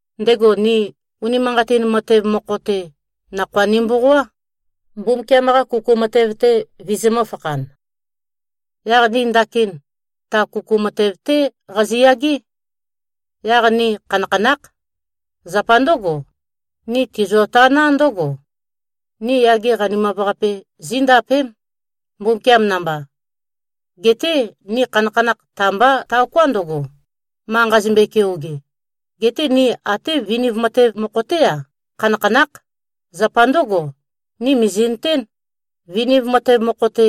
Ndego ni, unimanqatin matev mokho-te, nakhoa nimboqoá, Mbumbukiam-qa kuku matev-te vizimø̄-fakhan. Yaq ni ndakin ta kuku matev-té qaziyagé. Yaq ni khanakhanákh. Zapa ndǿgo, ni tizio-taná ndǿgo: Ni yage qanimav-qape zíndapém, Mbumbukiam namba. Geté ni khanakhanakh ta-mbá taoká ndøgo, ma nqazimbøe-keoge. Geté ni até viniv matev mokho-té-a, khanakhanákh. Zapa ndǿgo, ni mìzi꞉nøtén, viniv matev mokho-te,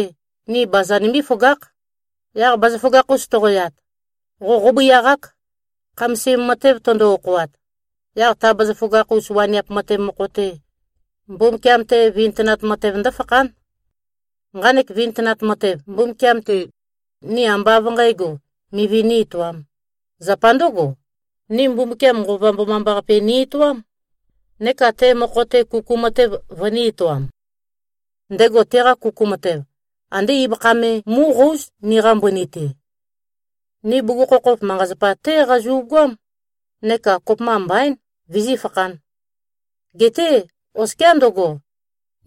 ni baza nimbí-føgákh. Yaq bazaføgakh-us toqoyat, qo qóbøiaqák, khamasim matev tøndo-okhoat. Yaq ta bazaføgakh-us waniap matev mokho-te, Mbumbukiam-te vintønat matev ndǿfakhán. Nqanek vintønat matev, Mbumbukiam-te, ni ambá av nqǣgo, mivi nī-etoām. Zapa ndǿgo, ni Mbumbukiam Nqova Mbomambaqape ni-etoám, neka te mokho-te kuku matev vønī-etoam. Ndego teqa kuku matev, andé ibøkha me mu꞉qóuz, niqa mbøni-te. Ni bugukhokhof manqa-zapa-té qazu꞉goám, neka kopømba mbaín, vizífakhān. Geté oskiá ndøgo,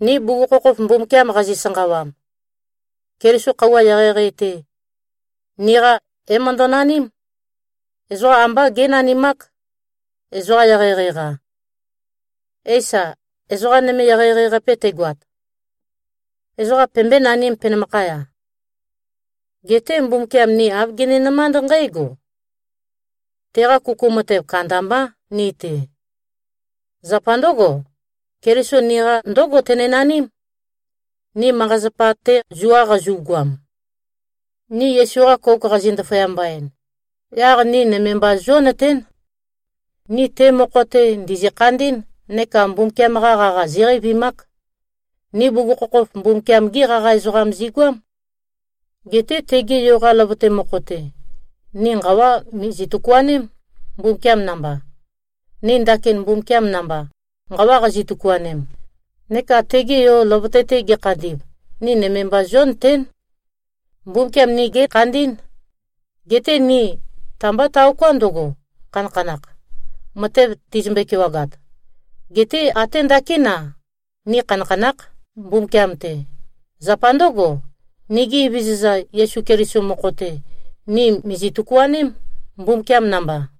ni bugukhokhof Mbumbukiam qazi-sanqawam, Keliso khøuwa eqeieqei-te, niqa é-møndønaním. Ezoqa ambá génanimák, ezoqa eqeieqei-qa. Éisa, ezoqa nøme eqeieqei-qape tegoat, ezoqa pembøé-nanīm, penømakhaya? Geté Mbumbukiam ni āv gininømánd nqǽgo: Teqa kuku matev kandambá ni-te. Zapa ndǿgo, Keliso niqa ndǿgo tenø-naním, ni manqa-zapa-te zua qazu꞉goam. Ni Yesu-qa kouk qazi꞉-ndaføyamba-en, yaq ni nøme mba zionøtén: Ni te mokho-te ndìzi-khandí꞉n neka Mbumbukiam-qa qaqa zíqeivimák. Ni bugukhokhof Mbumbukiam-gí qaqa ezoqam zigoám. Geté tege yo-qa løvøte mokho-te, ni nqawa mìzi-tøkuaném, Mbumbukiam namba. Ni ndakin Mbumbukiam namba nqawa qazi-tøkuanem, neka tege yo, løvøte-te gekhandi꞉v, ni nøme mba zionøtén, Mbumbukiam ni gékhandí꞉n. Geté ni ta-mbá taoká ndøgo, khanakhanākh, matev tizimbøe-kewagat. Geté até ndakín-a, ni khanakhanákh, Mbumbukiam-te. Zapa ndǿgo, nigi Evezøza Yesu Keliso mokho-te, ni mìzi-tøkuaném, Mbumbukiam namba.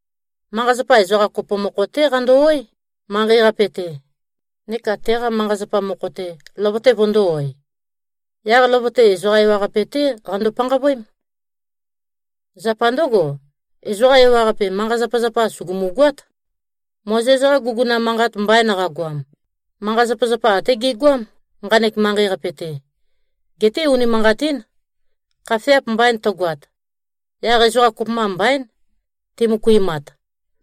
Manqa-zapa, ezoqa kopo mokho-té qando-oé, manqei-qape-te, neka teqa manqa-zapa mokho-te, løvøte vøndō-oe. Yaq løvøte, ezoqa ewaqape-té qando-panqavøém. Zapa ndǿgo, ezoqa ewaqape manqa-zapazapa sùgumu-goát. Mozes-qa guguna manqat mbain qagoam, manqa-zapazapa até gegoám, nqanek manqei-qape-te. Geté unimanqatín, khafeap mbain tøgoat, yaq ezoqa kopømba mbaín, timøkuimat,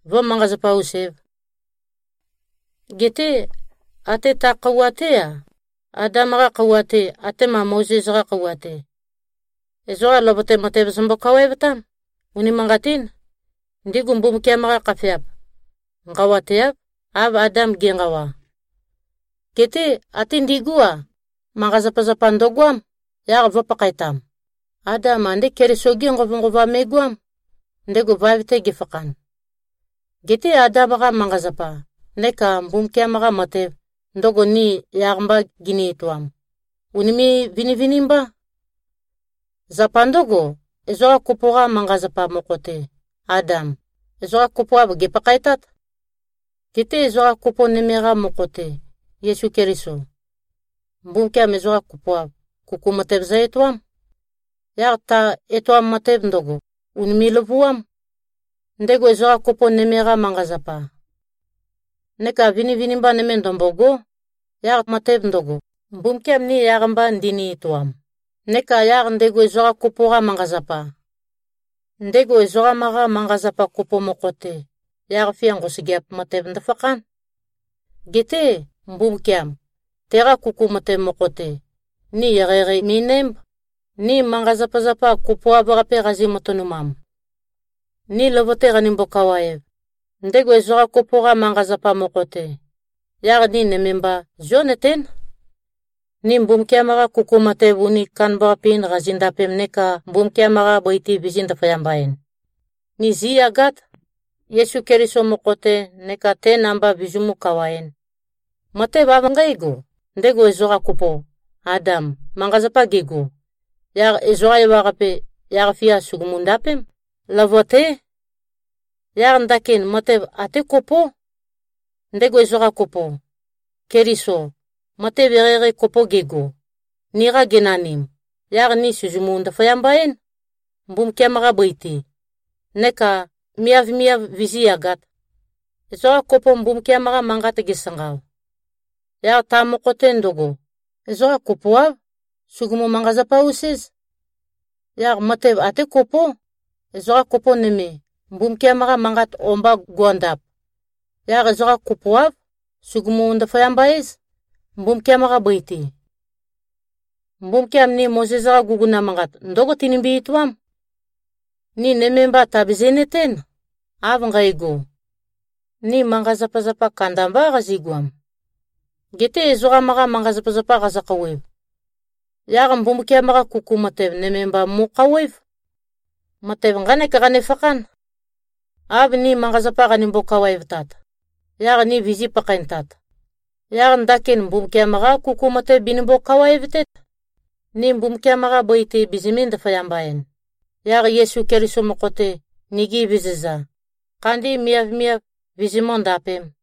vǿ-manqa-zapa-us-ēv. Geté até ta khøuwa-té-a, Adam-qa khøuwa-te atema Mozes-qa khøuwa-te, ezoqa løvøte matev zømbo-kawaevtám. Unimanqatín. Ndigu Mbumbukiam-qa khafeap nqawateáv, av Adam ge꞉nqawa. Geté até ndigú-a, manqa-zapazapa ndøgoám, yaq vø̄pakhaetam. Adam andé Keliso-gé nqovønqova me꞉goám, ndego vaev-te gefakhan. Geté Adam-qa manqa-zapa neka Mbumbukiam-qa matev, ndøgo ni yaq-mba gini-etoam, ùnime꞉-vinivinimbá. Zapa ndǿgo, ezoqa kopo-qa manqa-zapa mokho-te, Adam, ezoqa kopoav gèpakhaetát. Geté ezoqa kopo nøme-qa mokho-te, Yesu Keliso, Mbumbukiam ezoqa kopoav, kuku matev zø-etoám. Yaq ta etoam matev ndøgo, ùnime꞉-løvuám, ndego ezoqa kopo nøme-qa manqa-zapa. Neka vinivinimba nøme ndømbôgó, yaq matev ndøgo, Mbumbukiam ni yaq-mba ndini-etoam neka yaq ndego ezoqa kopo-qa manqa-zapa. Ndego ezoqam-qa manqa-zapa kopo mokho-te, yaq-fia nqosøgeap matev ndøfakhán. Geté Mbumbukiam, teqa kuku matev mokho-te, ni eqeieqei mi꞉nǽmb, ni manqa-zapazapa kopoav-qape qazi-matønumam. Ni løvøte qanimbo-kawaev, ndego ezoqa kopo-qa manqa-zapa mokho-te, yaq ni nøme mba zionøtén: Ni Mbumbukiam-qa kuku matev uni kandambaqape-in qazindapem neka Mbumbukiam-qa bøi-te vizī-ndaføyamba-en, ni zíyagát, Yesu Keliso mokho-te, neka te namba vizimú-kawaēn. Matev av nqǽgo: Ndego ezoqa kopo, Adam, manqa-zapa gego, yaq ezoqa ewaqape, yaq-fia sùgumu-ndapém. Løvøté. Yaq ndakin matev até kopó. Ndego ezoqa kopo, Keliso, matev eqeieqei kopo gego, niqa genanim, yaq ni sìzimu-ndaføyamba-én, Mbumbukiam-qa bøi-te, neka miavmiav vizíyagāt. Ezoqa kopo Mbumbukiam-qa manqat gesanqao, yaq ta mokho-te ndøgo, ezoqa kopoáv, sùgumu-manqa-zapa-us-éz. Yaq matev ate kopó. Ezoqa kopo nøme, Mbumbukiam-qa manqat o-mba go꞉ndap, yaq ezoqa kopoáv, sugumú-ndaføyamba-éz, Mbumbukiam-qa bøi-te. Mbumbukiam ni Mozes-qa guguna manqat ndǿgo tinimbi-etoám: Ni nøme mba tàbizi꞉-nøtén, av nqægo, ni manqa-zapazapa kandambá qazigoam. Geté ezoqam-qa manqa-zapazapa qazø-khouwev, yaq Mbumbukiam-qa kuku matev nøme mba mo꞉khouwév. Matev nqánek qanefakhán: Av ni manqa-zapa qanimbo-kawaevtat, yaq ni vizī-pakhaentat, yaq ndakin Mbumbukiam-qá kuku matev binimbo-kawaevtét, ni Mbumbukiam-qa bøi-te bizimī-ndaføyamba-en, yaq Yesu Keliso mokho-te, nigi Evezøza, khandi miavmiav vizimǿ-ndapēm.